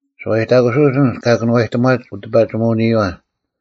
ᓱᐛᔨᑕᑯᓱᐅᒡ ᐊᓐᒡ ᑲ ᑭᓄᐛᔨᑎᒺᒡ ᐅᑎᐸᒋᒧᐅᓂᔪᐛ,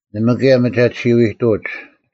ᓇᒪ ᑭᔭ ᒥᒐᑎᓯᐅ-ᐃᑐᐅᒡ: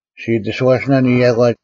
ᔅᒋ ᐃᑎᓱᐛᓯᓇᓐ ᐃᔭᒂ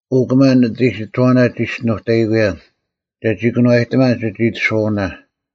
ᐅ ᑭᒪ ᓂᑦ ᐃᓯᑥᐅᓇ ᒋ ᒋᔅᒋᓄᑕᐃᑯᔭᓐ ᒐᒋ ᑭᓄᐛᔨᑎᒪᓐ ᒋᑦ ᐃᑎᓱᐛᐅᓇ!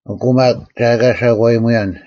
ᐊᑯ ᒪᒃ ᒐ ᐊᑲ ᓴᒂᔨᒧᔭᓐ,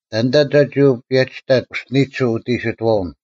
ᑕᓐᑕ ᒐᒋ ᐅᒋ ᐸᔭᒋᑕᑦ ᐅᔅᒋᓂᒋᓱᐤ ᐅᑦ ᐃᓯᑥᐅᓐ?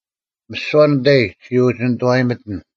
ᒥᓯᐛ ᓂᑕᐃᒡ ᔅᒋ ᐅᒋ ᓇᓂᑐᐛᔨᒥᑎᓐ: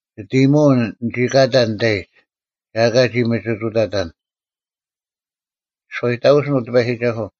ᒋᑦ ᐃᔨᒧᐅᓐ ᓂᒋ ᑲᑕᓐ ᓂᑕᐃᒡ, ᒋ ᓱᐛᔨᑕᑯᓯᓐ, ᐅ ᑎᐸᔨᒋᒐᓱᐤ: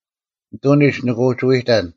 ᓂᑐᓂᒡ ᓂᒋ ᐅᒋ ᐎᑕᓐ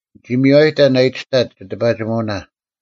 ᓂᒋ ᒥᔽᔨᑕᓐ ᐊ ᐃᑎᔅᑕᒋ ᒋᑎᐸᒋᒧᐅᓇ,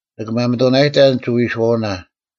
ᓂᑭ ᒪᒥᑐᓇᔨᑕᓐ ᒋᐎᓱᐛᐅᓇ,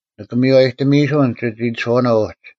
ᓂᑭ ᒥᔽᔨᑎᒥᐃᓱᓐ ᒋᑦ ᐃᑎᓱᐛᐅᓇ ᐅᒡ: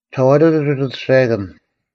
ᒋᓴᐛᑐᑐᐤ ᒋᑦ ᐊᑐᔅᒐᔭᑭᓐ,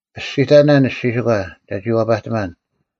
ᐸᔅᒋᑕᓇ ᓂᔅᒋᓯᒂ, ᒐᒋ ᐛᐸᑎᒪᓐ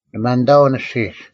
ᓂ ᒪᓐᑕᐅᓐ ᐊᔅᒋᒡ: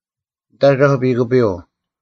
ᓂᑦ ᐊᒐᐧᒄ ᐱᑯᐱᔪᐤ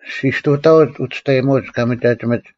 ᔅᒋ ᒋᔅᑐᑕᐅᒡ ᐅᒋᔅᑕᔨᒧᐅᒡ ᑲ ᒥᒐᒋᒥᒡ,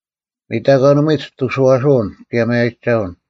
ᒥᑕᒂᓇᒧᐎ ᒋᑐᓱᐛᐅᓐ ᑭᔭ ᒪᔭᔨᒐᐅᓐ;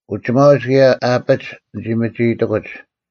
ᐅᒋᒪᐅᒡ ᑭᔭ ᐊ ᐊᐱᒡ ᓂᒋ ᒪᒋ ᐃᑎᑯᒡ;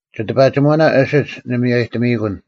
ᒋᑎᐸᒋᒧᐅᓇ ᐊᓯᒡ ᓂ ᒥᔽᔨᑎᒥᐃᑯᓐ;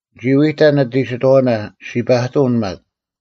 ᓂᒋ ᐎᑕᓐ ᓂᑦ ᐃᓯᑥᐅᓇ, ᔅᒋ ᐸᑐᐅᓐ ᒪᒃ: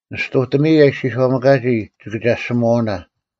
ᓂᔅᑐᑎᒥᐃ ᐊ ᐃᔅᒋᔄᒥᑲᒋ ᒋᑭᒐᔅᒋᒧᐛᐅᓇ: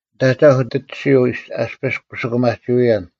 ᓂᑦ ᐊᒐᐧᒄ ᑎᒋᓱᐤ ᐊᔅᐱᔅ ᑯᓯᑯᒪᒋᐅᔭᓐ: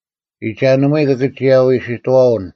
ᐃᒐᓇᒧᐎ ᑭᑭᒋᔭᐎ ᐃᓯᑥᐅᓐ;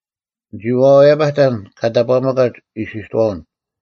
ᓂᒋ ᐛᐛᔭᐸᑕᓐ ᑲ ᑕᑈᒥᑲᒡ ᐃᓯᑥᐅᓐ: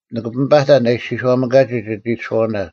ᓂᑭ ᐱᒥᐸᑕᓐ ᐊ ᐃᔅᒋᔄᒥᑲᒋ ᒋᑦ ᐃᑎᓱᐛᐅᓇ,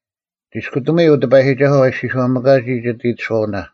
ᒋᔅᑭᑎᒧᐎ, ᐅ ᑎᐸᔨᒋᒐᓱᐤ ᐊ ᐃᔅᒋᔄᒥᑲᒋ ᒋᑦ ᐃᑎᓱᐛᐅᓇ;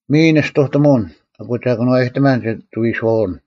ᒥᔨ ᓂᔅᑐᑎᒧᐅᓐ, ᐊᑯ ᒐ ᑭᓄᐛᔨᑎᒪᓐ ᒋᐎᓱᐛᐅᓐ;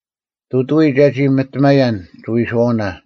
ᑐᑐᐎ ᒐᒋ ᒥᑎᒪᔭᓐ ᒋᐎᓱᐛᐅᓇ;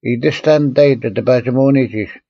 ᐃᑎᔅᑕ ᓂᑕᐃ ᒋᑎᐸᒋᒧᐅᓂᒡ ᐃᓯ,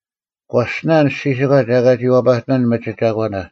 ᒂᔅᒋᓇ ᓂᔅᒋᓯᒂ ᒐ ᐊᑲ ᒋ ᐛᐸᑎᒪᓐ ᒥᒋ ᒐᒂᓇ;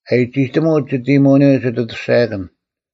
ᐊᔨᒋᑎᒧᐤ ᒋᑦ ᐃᔨᒧᐅᓂᔪᐤ ᒋᑦ ᐊᑐᔅᒐᔭᑭᓐ,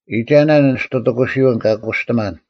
ᐃᒐᓇ ᓂᔅᑐᑎᑯᓯᐅᓐ ᑲ ᑯᔅᑎᒪᓐ;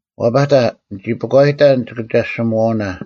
ᐛᐸᑕ, ᓂᒋ ᐱᒂᔨᑕᓐ ᒋᑭᒐᔅᒋᒧᐛᐅᓇ: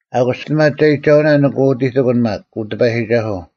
ᐊᑯᔅ ᒋᒋᔅᑎᒪᒐᔨᒋᒐᐅᓇ ᓂᑭ ᐅᑎᑎᑯᓐ ᒪᒃ, ᐅ ᑎᐸᔨᒋᒐᓱᐤ,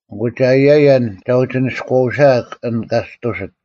ᐊᑯ ᒐ ᐊᔭᔭᓐ ᒐ ᐅᒋ ᓂᔎᐅᓯᐊᒃ ᐊᓐ ᑲ ᔅᑐᓯᑦ;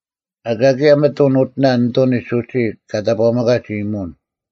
ᐊᑲ ᑭᔭ ᒥᑐᓐ ᐅᑎᓇ ᓂᑐᓂᒡ ᐅᒋ ᑲ ᑕᑈᒥᑲᒡ ᐃᔨᒧᐅᓐ;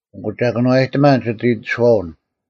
ᐊᑯ ᒐ ᑭᓄᐛᔨᑎᒪᓐ ᒋᑦ ᐃᑎᓱᐛᐅᓐ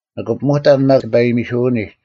ᓂᑭ ᐱᒧᑕᓐ ᒪᒃ ᑎᐸᔨᒥᓱᐅᓂᒡ;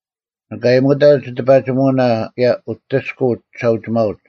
ᓂᑭ ᐊᔨᒧᑕᓐ ᒋᑎᐸᒋᒧᐅᓇ ᑭᔭ ᐅᑎᔅᑯᐤ ᒋᓴᐅᒋᒪᐅᒡ,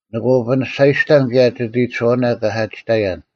ᓂᑭ ᐅᐱᓂᔅᒐᔨᔅᑕᓐ ᑭᔭ ᒋᑦ ᐃᑎᓱᐛᐅᓇ ᑲ ᓴᒋᑕᔭᓐ;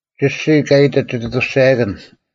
ᒋᔅᒋ ᑲ ᐃᑎᑦ ᒋᑦ ᐊᑐᔅᒐᔭᑭᓐ,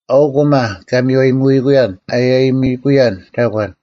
ᐊᐅᒄ ᐅᒪ ᑲ ᒥᔽᔨᒧᐃᑯᔭᓐ ᐃᔭᔨᒥᐃᑯᔭᓐ ᒐᒂᓐ: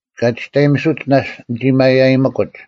ᑲ ᒋᔅᑕᔨᒥᓱᒡ ᓇᔅᒡ ᓂᒋ ᒥᒪᔭᔨᒥᑯᒡ: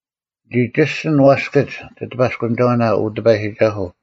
ᓂᒋ ᒋᔅᒋᓐ ᐛᔅᑭᒡ ᒋᑎᐸᔅᑯᓂᒐᐅᓇ, ᐅ ᑎᐸᔨᒋᒐᓱᐤ;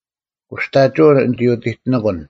ᑯᔅᑕᒋᐅᓐ ᓂᒋ ᐅᑎᑎᓂᑯᓐ,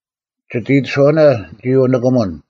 ᒋᑦ ᐃᑎᓱᐛᐅᓇ ᓂᒋ ᐅᓂᑭᒧᓐ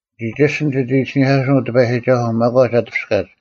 ᓂᒋ ᒋᔅᒋᓐ ᒋᑦ ᐃᓯᓂᐧᑲᓱᐅᓐ, ᐅ ᑎᐸᔨᒋᒐᓱᐤ, ᒪᒂᒡ ᐊ ᑎᐱᔅᑲᒡ,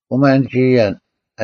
ᐅᒪ ᓂᒋ ᐊᔭᓐ: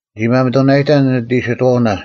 ᓂᒋ ᒪᒥᑐᓇᔨᑕᓐ ᓂᑦ ᐃᓯᑥᐅᓇ,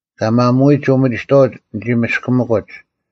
ᑲ ᒪᒧᐎᒡ ᐅᒪᒋᑥᐅᒡ ᓂᒋ ᒥᔅᑭᒥᑯᒡ;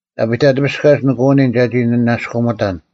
ᐊ ᐊᐱᑕᑎᐱᔅᑲᒡ ᓂᑭ ᐅᓂᓐ ᒐᒋ ᓂᓇᔅᑯᒥᑕᓐ,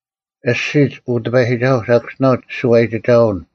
ᐊᔅᒋᒡ, ᐅ ᑎᐸᔨᒋᒐᓱᐤ, ᓴᑭᔅᒋᓇᐤ ᒋᓱᐛᔨᒋᒐᐅᓐ: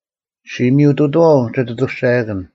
ᔅᒋ ᒥᔪᑐᑐᐛᐤ ᒋᑦ ᐊᑐᔅᒐᔭᑭᓐ,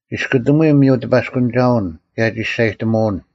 ᒋᔅᑯᑎᒧᐎ ᒥᔪ ᑎᐸᔅᑯᓂᒐᐅᓐ ᑭᔭ ᒋᔅᒐᔨᑎᒧᐅᓐ: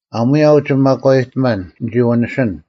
ᐊᒺᔭ ᐅᒋ ᒪᒂᔨᑎᒪᓐ ᓂᒋ ᐛᓂᓯᓐ;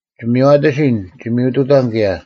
ᒋ ᒥᔽᑎᓯᓐ, ᒋ ᒥᔪᑐᑕᓐ ᑭᔭ: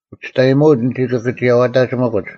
ᐅᒋᔅᑕᔨᒧᐅᒡ ᓂᒋ ᑭᑭᒋᔭᐛᑕᒋᒥᑯᒡ;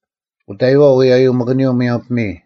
ᐅᑕᐃᐛᐤ ᐎᔨᔪᒪᑭᓂᔪᐤ ᒧᔭᒻ ᐱᒥᔾ;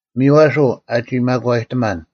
ᒥᔽᓱᐤ ᐊᒋ ᒪᒂᔨᑎᒪᓐ;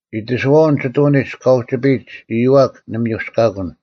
ᐃᑎᓱᐛᐅᓐ ᒋᑐᓂᒡ ᑲ ᐅᒋᐱᔨᒡ ᐊᔪᐛᒃ ᓂ ᒥᔪᔅᑲᑯᓐ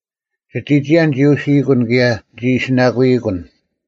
ᒋᑎᒋᔭ ᓂᒋ ᐅᓯᐃᑯᓐ ᑭᔭ ᓂᒋ ᐃᓯᓇᑯᐃᑯᓐ;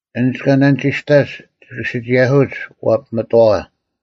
ᐊᓐᒡ ᑲ ᓇᓂᒋᔅᑕᔅᒡ ᒋᑭ ᓯᒋᔭᓱᐅᒡ ᐛᐱᒥᑥᐛ;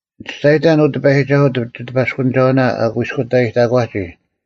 ᓂ ᒋᔅᒐᔨᑕᓐ, ᐅ ᑎᐸᔨᒋᒐᓱᐤ, ᒋᑎᐸᔅᑯᓂᒐᐅᓇ ᐊ ᑯᐃᔅᑯᑕᔨᑕᒂᒋ,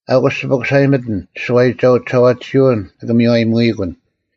ᐊᑯᔅ, ᒋ ᐱᑯᓴᔨᒥᑎᓐ, ᒋᓱᐛᔨᒋᒐᐤ ᒋᓴᐛᑎᓯᐅᓐ ᓂᑭ ᒥᔽᔨᒧᐃᑯᓐ,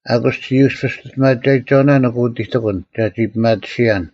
ᐊᑯᔅ ᒋ ᔪᔅᐱ ᒋᔅᑎᒪᒐᔨᒐᐅᓇ ᓂᑭ ᐅᑎᑎᑯᓐ, ᒐᒋ ᐱᒪᑎᓯᔭᓐ;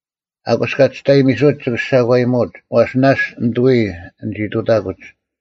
ᐊᑯᔅ ᑲ ᒋᔅᑕᔨᒥᓱᒡ ᒋᑭ ᓴᒂᔨᒧᐅᒡ; ᐛᔅ ᓇᔅᒡ ᓂᑐᐎ ᓂᒋ ᑐᑕᑯᒡ: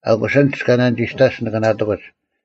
ᐊᑯᔅ ᐊᓐᒡ ᑲ ᓇᓂᒋᔅᒡ, ᓂᑭ ᓇᑎᑯᒡ,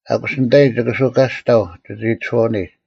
ᐊᑯᔅ ᓂᑕᐃ ᒋᑭ ᓱᑲᔅᑕᐤ ᒋᑦ ᐃᑎᓱᐛᐅᓂᒡ;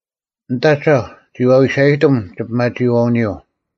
ᓂᑦ ᐊᒐᐧᒄ ᒋ ᐛᐎᓴᔨᑎᒻ ᒋ ᐱᒪᒋᐃᐛᐅᓂᔪᐤ;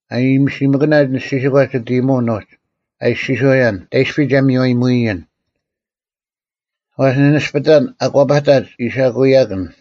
ᐊᔨᒥᓯᒥᑲᓇ ᓂᔅᒋᓯᒂ ᒋᑦ ᐃᔨᒧᐅᓐ ᐅᒡ, ᐊ ᐃᔅᒋᔄᔭᓐ, “ᑕᐃᔅᐱ ᒐ ᒥᔽᔨᒧᐃᔨᓐ?” ᐛᔅ ᓂ ᓂᔅᐱᑕᓐ ᐊᒂᐸᑕᒡ ᐃᓴᑯᐃ-ᐎᔭᑭᓐ,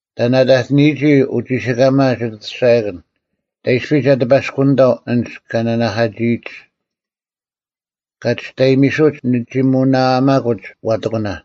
ᑕᓐ ᐊᑕᑎᓂᔨᒋ ᐅᒋᓯᑲᒪ ᒋᑦ ᐊᑐᔅᒐᔭᑭᓐ? ᑕᐃᔅᐱ ᒐ ᑎᐸᔅᑯᓂᑥᐤ ᐊᓐᒡ ᑲ ᓂᓇᐧᑲᒋᐃᒡ? ᑲ ᒋᔅᑕᔨᒥᓱᒡ ᓂᒋ ᒧᓇᐊᒪᑯᒡ ᐛᑎᑯᓇ,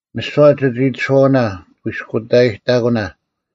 ᒥᓯᐛ ᒋᑦ ᐃᑎᓱᐛᐅᓇ ᑯᐃᔅᑯᑕᔨᑕᒂᓇ;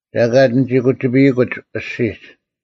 ᒐᑲᑦ ᓂᒋ ᑯᒋᐱᔨᑯᒡ ᐊᔅᒋᒡ;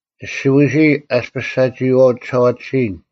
ᒋᓯᐎᓯᐃ ᐊᔅᐱᔅ ᓴᒋᐃᐛᐤ ᒋᓴᐛᑎᓯᔨᓐ;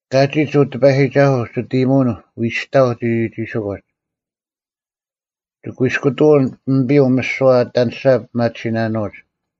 ᑲᒋᒡ, ᐅ ᑎᐸᔨᒋᒐᓱᐤ, ᒋᑦ ᐃᔨᒧᐅᓐ ᐎᔨᔅᑕᐤ ᒋᒋᒋᓯᑯᒡ᙮ ᒋᑯᐃᔅᑯᑐᐅᓐ ᐱᒥᐱᔪᐤ ᒥᓯᐛ ᐊ ᐊᑎ ᐊᓂᔅᒐ ᐱᒪᑎᓯᓇᓄᐅᒡ: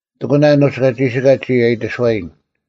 ᑎᑯᓇ ᐊᓄᒡ ᑲ ᒋᓯᑲᒡ ᒋᔾ ᐊ ᐃᑎᓱᐛᔨᓐ;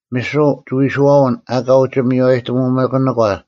ᒥᓱᐤ ᒋᐎᓱᐛᐅᓐ ᐊᑲ ᐅᒋ ᒥᔽᔨᑎᒪᓇᒂ,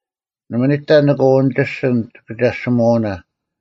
ᓇᒪ ᓂᑕ ᓂᑭ ᐅᓂᒋᔅᒋᓐ ᒋᑭᒐᔅᒋᒧᐛᐅᓇ;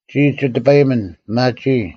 ᒋᔾ ᒋ ᑎᐸᔨᒥᓐ, ᐱᒪᒋᐃ;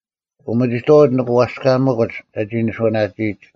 ᐅᒥᒋᑥᐅᒡ ᓂᒋ ᐊᔅᑲᒪᑯᒡ ᒐᒋ ᓂᓱᐅᓇᒋᐃᒡ;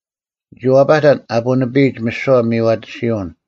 ᓂᒋ ᐛᐸᑕᓐ ᐊ ᐳᓂᐱᔨᒡ ᒥᓯᐛ ᒥᔽᑎᓯᐅᓐ;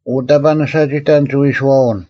ᐅ, ᑕᑈ ᓂ ᓴᒋᑕᓐ ᒋᐎᓱᐛᐅᓐ!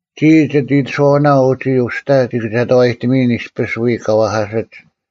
ᒋᔾ ᒋᑦ ᐃᑎᓱᐛᐅᓇ ᐅᒋ ᐅᔅᑕ ᔅᒋ ᑭᒐᑕᐛᔨᑎᒥᐃᓐ ᐃᔅᐱᔅ ᐎ ᑲ ᐛᐧᑲᓯᒡ: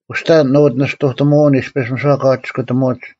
ᐅᔅᑕ ᓂᑦ ᐅᓂᔅᑐᑎᒧᐅᓐ ᐃᔅᐱᔅ ᒥᓯᐛ ᑲ ᒋᔅᑯᑎᒧᐅᒡ: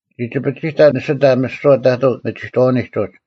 ᓂᒋ ᒋᐱᒋᑕᓐ ᓂᓯᑕ ᒥᓯᐛ ᑕᑐ ᒥᒋᑥᐅᓂᒡ ᐅᒡ,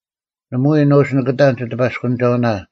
ᓇᒪᐎᔾ ᓄᒋ ᓂᑭᑕᓐ ᒋᑎᐸᔅᑯᓂᒐᐅᓇ;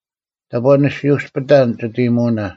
ᑕᑈ ᓂ ᓯᐅᔅᐱᑕᓐ ᒋᑦ ᐃᔨᒧᐅᓇ!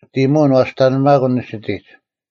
ᒋᑦ ᐃᔨᒧᐅᓐ ᓂᐛᔅᑕᓂᐱᒪᑭᓐ ᓂᓯᑎᒡ,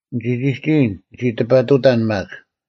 ᓂᒋ ᒋᒋ ᐃᔨᓐ, ᓂᒋ ᑎᐱᑐᑕᓐ ᒪᒃ,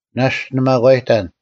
ᓇᔅᒡ ᓂ ᒪᒂᔨᑕᓐ: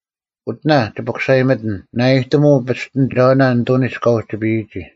ᐅᑎᓇ, ᒋ ᐱᑯᓴᔨᒥᑎᓐ, ᓇᐊᔨᑎᒧᐤ ᐱᔅᑎᓂᒐᐅᓇ ᓂᑐᓂᒡ ᑲ ᐅᒋᐱᔨᒋ,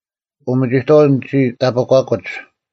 ᐅᒥᒋᑥᐅᒡ ᓂᒋ ᑕᐱᒂᑯᒡ;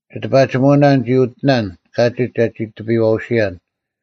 ᒋᑎᐸᒋᒧᐅᓇ ᓂᒋ ᐅᑎᓇᓐ ᑲᒋᒡ ᒐᒋ ᑎᐱᔨᐛᐅᓯᔭᓐ;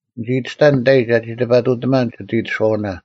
ᓂᒋ ᐃᑎᔅᑕᓐ ᓂᑕᐃ ᒐᒋ ᑎᐱᑐᑎᒪᓐ ᒋᑦ ᐃᑎᓱᐛᐅᓇ,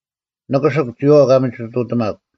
ᓂᑭᓯᒄ, ᒋᔨᐛᐤ ᑲ ᒥᒋᑐᑎᒪᒄ: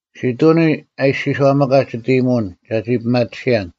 ᓯᑐᓂ ᐊ ᐃᔅᒋᔄᒥᑭᒡ ᒋᑦ ᐃᔨᒧᐅᓐ, ᒐᒋ ᐱᒪᑎᓯᔭᓐ: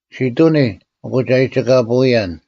ᓯᑐᓂ, ᐊᑯ ᒐ ᐊᔨᒋᑲᐳᐅᔭᓐ;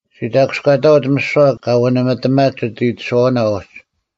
ᔅᒋ ᑕᑯᔅᑲᑕᐅᒡ ᒥᓯᐛ ᑲ ᐛᓂᒥᑎᒪᒡ ᒋᑦ ᐃᓯᑥᐅᓇ ᐅᒡ;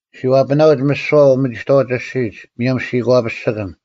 ᒋ ᐛᐱᓇᐅᒡ ᒥᓯᐛ ᐅᒥᒋᑥᐅᒡ ᐊᔅᒋᒡ ᒧᔭᒻ ᓯᒂᐱᔅᒋᑭᓐ: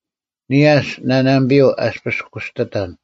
ᓂᔭᔅ ᓇᓇᒥᐱᔪᐤ ᐊᔅᐱᔅ ᑯᔅᑎᑕᓐ,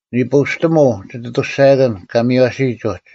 ᓂᐳᐅᔅᑎᒧᐤ ᒋᑦ ᐊᑐᔅᒐᔭᑭᓐ ᑲ ᒥᔽᓯᔨᒡ ᐅᒡ: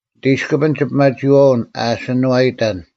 ᓂᑦ ᐃᔅᑭᐱᓐ ᒋᐱᒪᒋᐃᐛᐅᓐ ᐊ ᐊᓯᓂᐛᑕᔭᓐ,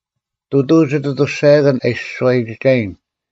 ᑐᑐᐤ ᒋᑦ ᐊᑐᔅᒐᔭᑭᓐ ᐊ ᐃᓯ ᓱᐛᔨᒋᒐᔨᓐ,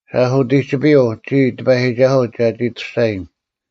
ᓴᔅ ᐅᑎᒋᐱᔪᐤ, ᒋᔾ, ᑎᐸᔨᒋᒐᓱᐤ, ᒐᒋ ᐊᑐᔅᒐᔨᓐ;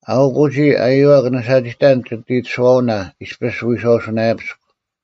ᐊᐅᒄ ᐅᒋ ᐊᔪᐛᒃ ᓂ ᓴᒋᑕᓐ ᒋᑦ ᐃᑎᓱᐛᐅᓇ ᐃᔅᐱᔅ ᐎᔄᐅᓱᓇᔭᐱᔅᒄ;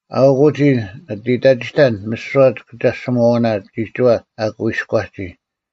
ᐊᐅᒄ ᐅᒋ ᓂ ᐃᑕᒋᑕᓐ ᒥᓯᐛ ᒋᑭᒐᔅᒋᒧᐛᐅᓇ ᒋᒋᐛ ᐊ ᑯᐃᔎᒋ;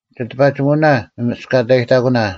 ᒋᑎᐸᒋᒧᐅᓇ ᒪᒥᔅᑲᑕᔨᑕᑯᓇ: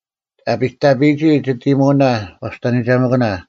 ᐊ ᐱᑕᐱᔨᒋ ᒋᑦ ᐃᔨᒧᐅᓇ ᐛᔅᑕᓂᒐᒥᑭᓇ;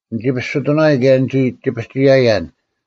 ᓂᒋ ᐸᔅᒋᑐᓇᔨᓐ ᑭᔭ ᓂᒋ ᒋᐱᒋᔭᔭᓐ;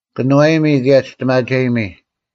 ᑭᓄᐛᐱᒥ, ᑭᔭ ᒋᔅᑎᒪᒐᔨᒥ,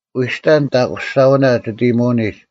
ᐎᔨᔅᑕ ᓂᑕᐧᑯᔅᒐᐅᓇ ᒋᑦ ᐃᔨᒧᐅᓂᒡ;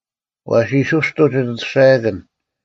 ᐛᓯᓱᔅᑐᐤ ᒋᑦ ᐊᑐᔅᒐᔭᑭᓐ;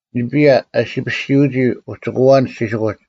ᓂᐱᔭ ᐊ ᓯᐱᓯᐅᒋ ᐅᒋᑯᐛ ᓂᔅᒋᓯᑯᒡ,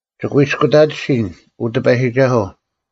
ᒋ ᑯᐃᔅᑯᑕᑎᓯᓐ, ᐅ ᑎᐸᔨᒋᒐᓱᐤ,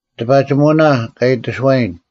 ᒋᑎᐸᒋᒧᐅᓇ, ᑲ ᐃᑎᓱᐛᔨᓐ,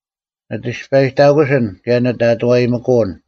ᓂᑦ ᐊᐱᔅᑕᔨᑕᑯᓯᓐ ᑭᔭ ᓂᑦ ᐊᑐᐛᔨᒥᑯᐅᓐ;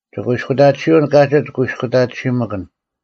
ᒋᑯᐃᔅᑯᑕᑎᓯᐅᓐ ᑲᒋᒡ ᑯᐃᔅᑯᑕᑎᓯᒥᑭᓐ,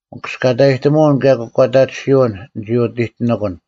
ᒥᑯᔅᑲᑕᔨᑎᒧᐅᓐ ᑭᔭ ᑯᒂᑕᑎᓯᐅᓐ ᓂᒋ ᐅᑎᑎᓂᑯᓐ;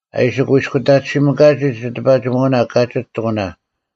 ᐊ ᐃᓯ ᒂᔭᔅᑯᑕᑎᓯᒥᑲᒋ ᒋᑎᐸᒋᒧᐅᓇ ᑲᒋᒡ ᑎᑯᓇ: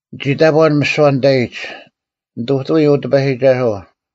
ᓂᒋ ᑕᑈᓐ ᒥᓯᐛ ᓂᑕᐃᒡ: ᓂᑐᑐᐎ ᐅ ᑎᐸᔨᒋᒐᓱᐤ: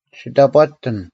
ᔅᒋ ᑕᑈᑎᑎᓐ: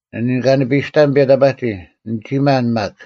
ᓂ ᓂᑲᓂᐸᔨᔅᑕᓐ ᐱᔭᑕᐸᒋ, ᓂᒋ ᒪᓐ ᒪᒃ: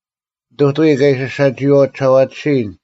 ᓂᑐᑐᐎ ᑲ ᐃᓯ ᓴᒋᐃᐛᐤ ᒋᓴᐛᑎᓯᔨᓐ: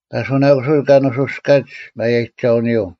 ᐸᓱᓇᑯᓯᐅᒡ ᑲ ᓄᓱᔅᑲᒡ ᒪᔭᔨᒐᐅᓂᔪᐤ;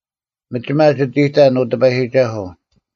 ᒥᒋᒪ ᒋᑦ ᐃᑕᓐ, ᐅ ᑎᐸᔨᒋᒐᓱᐤ;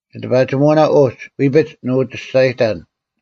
ᒋᑎᐸᒋᒧᐅᓇ ᐅᒡ, ᐎᐱᒡ ᓂᒋ ᐅᒋ ᒋᔅᒐᔨᑕᓐ,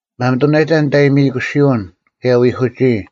ᒪᒥᑐᓂᔨᑕ ᓂᑦ ᐊᔨᒥᐃᑯᓯᐅᓐ, ᑭᔭ ᐎᐧᑯᒋᐃ;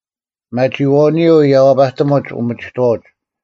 ᐱᒪᒋᐃᐛᐅᓂᔪᐤ ᔭᐛᐸᑎᒧᒡ ᐅᒥᒋᑥᐅᒡ: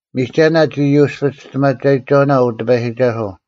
ᒥᒐᓇ ᒋ ᔪᔅᐱ ᒋᔅᑎᒪᒐᔨᒐᐅᓇ, ᐅ ᑎᐸᔨᒋᒐᓱᐤ: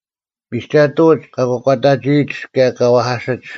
ᒥᒐᑐᐅᒡ ᑲ ᑯᒂᑕᒋᐃᒡ ᑭᔭ ᑲ ᐛᐧᑲᓯᒡ: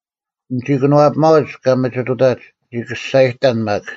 ᓂᒋ ᑭᓄᐛᐱᒪᐅᒡ ᑲ ᒥᒋᑐᑕᒡ, ᓂᒋ ᑲᔅᒐᔨᑕᓐ ᒪᒃ;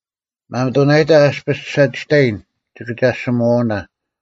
ᒪᒥᑐᓇᔨᑕ ᐊᔅᐱᔅ ᓴᒋᑕᔭᓐ ᒋᑭᒐᔅᒋᒧᐛᐅᓇ: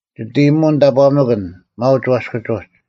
ᒋᑦ ᐃᔨᒧᐅᓐ ᑕᑈᒥᑭᓐ ᒪᐅᒡ ᐛᔅᑭᒡ ᐅᒡ: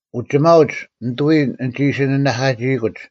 ᐅᒋᒪᐅᒡ ᓂᑐᐎ ᓂᒋ ᐃᓯ ᓂᓇᐧᑲᒋᐃᑯᒡ;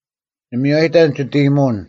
ᓂ ᒥᔽᔨᑕᓐ ᒋᑦ ᐃᔨᒧᐅᓐ,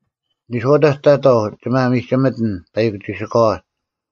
ᓂᔄᐅᑕᒡ ᑕᑥᐤ ᒋ ᒪᒥᒋᒥᑎᓐ ᐸᐃᒄ ᒋᓯᑲᐛ,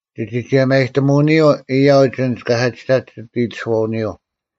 ᒋᒋ ᒋᔭᒪᔨᑎᒧᐅᓂᔪᐤ ᐊᔭᐅᒡ ᐊᓐᒡ ᑲ ᓴᒋᑕᒡ ᒋᑦ ᐃᑎᓱᐛᐅᓂᔪᐤ,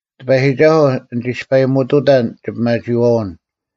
ᑎᐸᔨᒋᒐᓱᐤ, ᓂᒋ ᐊᔅᐸᔨᒧᑐᑕᓐ ᒋᐱᒪᒋᐃᐛᐅᓐ,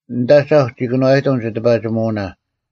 ᓂᑦ ᐊᒐᐧᒄ ᒋ ᑭᓄᐛᔨᑎᒻ ᒋᑎᐸᒋᒧᐅᓇ;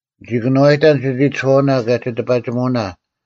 ᓂᒋ ᑭᓄᐛᔨᑕᓐ ᒋᑦ ᐃᑎᓱᐛᐅᓇ ᑭᔭ ᒋᑎᐸᒋᒧᐅᓇ;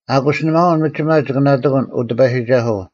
ᐊᑯᔅ ᓂᒪᐅᓐ ᒥᒋᒪ ᒋᑭ ᓇᑎᑯᓐ, ᐅ ᑎᐸᔨᒋᒐᓱᐤ: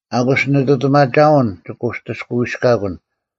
ᐊᑯᔅ ᓂᓂᑐᑎᒪᒐᐅᓐ ᒋᑭ ᐅᑎᔅᑲᐎᔅᑲᑯᓐ: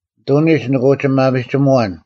ᓂᑐᓂᒡ ᓂᑭ ᐅᒋ ᒪᒥᒋᒧᐛᓐ,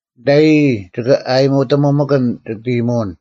ᓂᑕᔨᔾ ᒋᑭ ᐊᔨᒧᑎᒧᒪᑭᓐ ᒋᑦ ᐃᔨᒧᐅᓐ;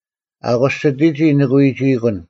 ᐊᑯᔅ ᒋᑎᒋᔾ ᓂᑭ ᐎᒋᐃᑯᓐ;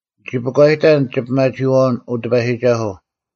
ᓂᒋ ᐱᒂᔨᑕᓐ ᒋᐱᒪᒋᐃᐛᐅᓐ, ᐅ ᑎᐸᔨᒋᒐᓱᐤ;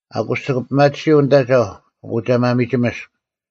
ᐊᑯᔅ ᒋᑭ ᐱᒪᑎᓯᐤ ᓂᑦ ᐊᒐᐧᒄ, ᐊᑯ ᒐ ᒪᒥᒋᒥᔅᒃ;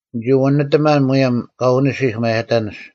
ᓂᒋ ᐛᓂᒥᑎᒪᓐ ᒧᔭᒻ ᑲ ᐅᓂᓯᐧᒃ ᒪᔭᑕᓂᔅ: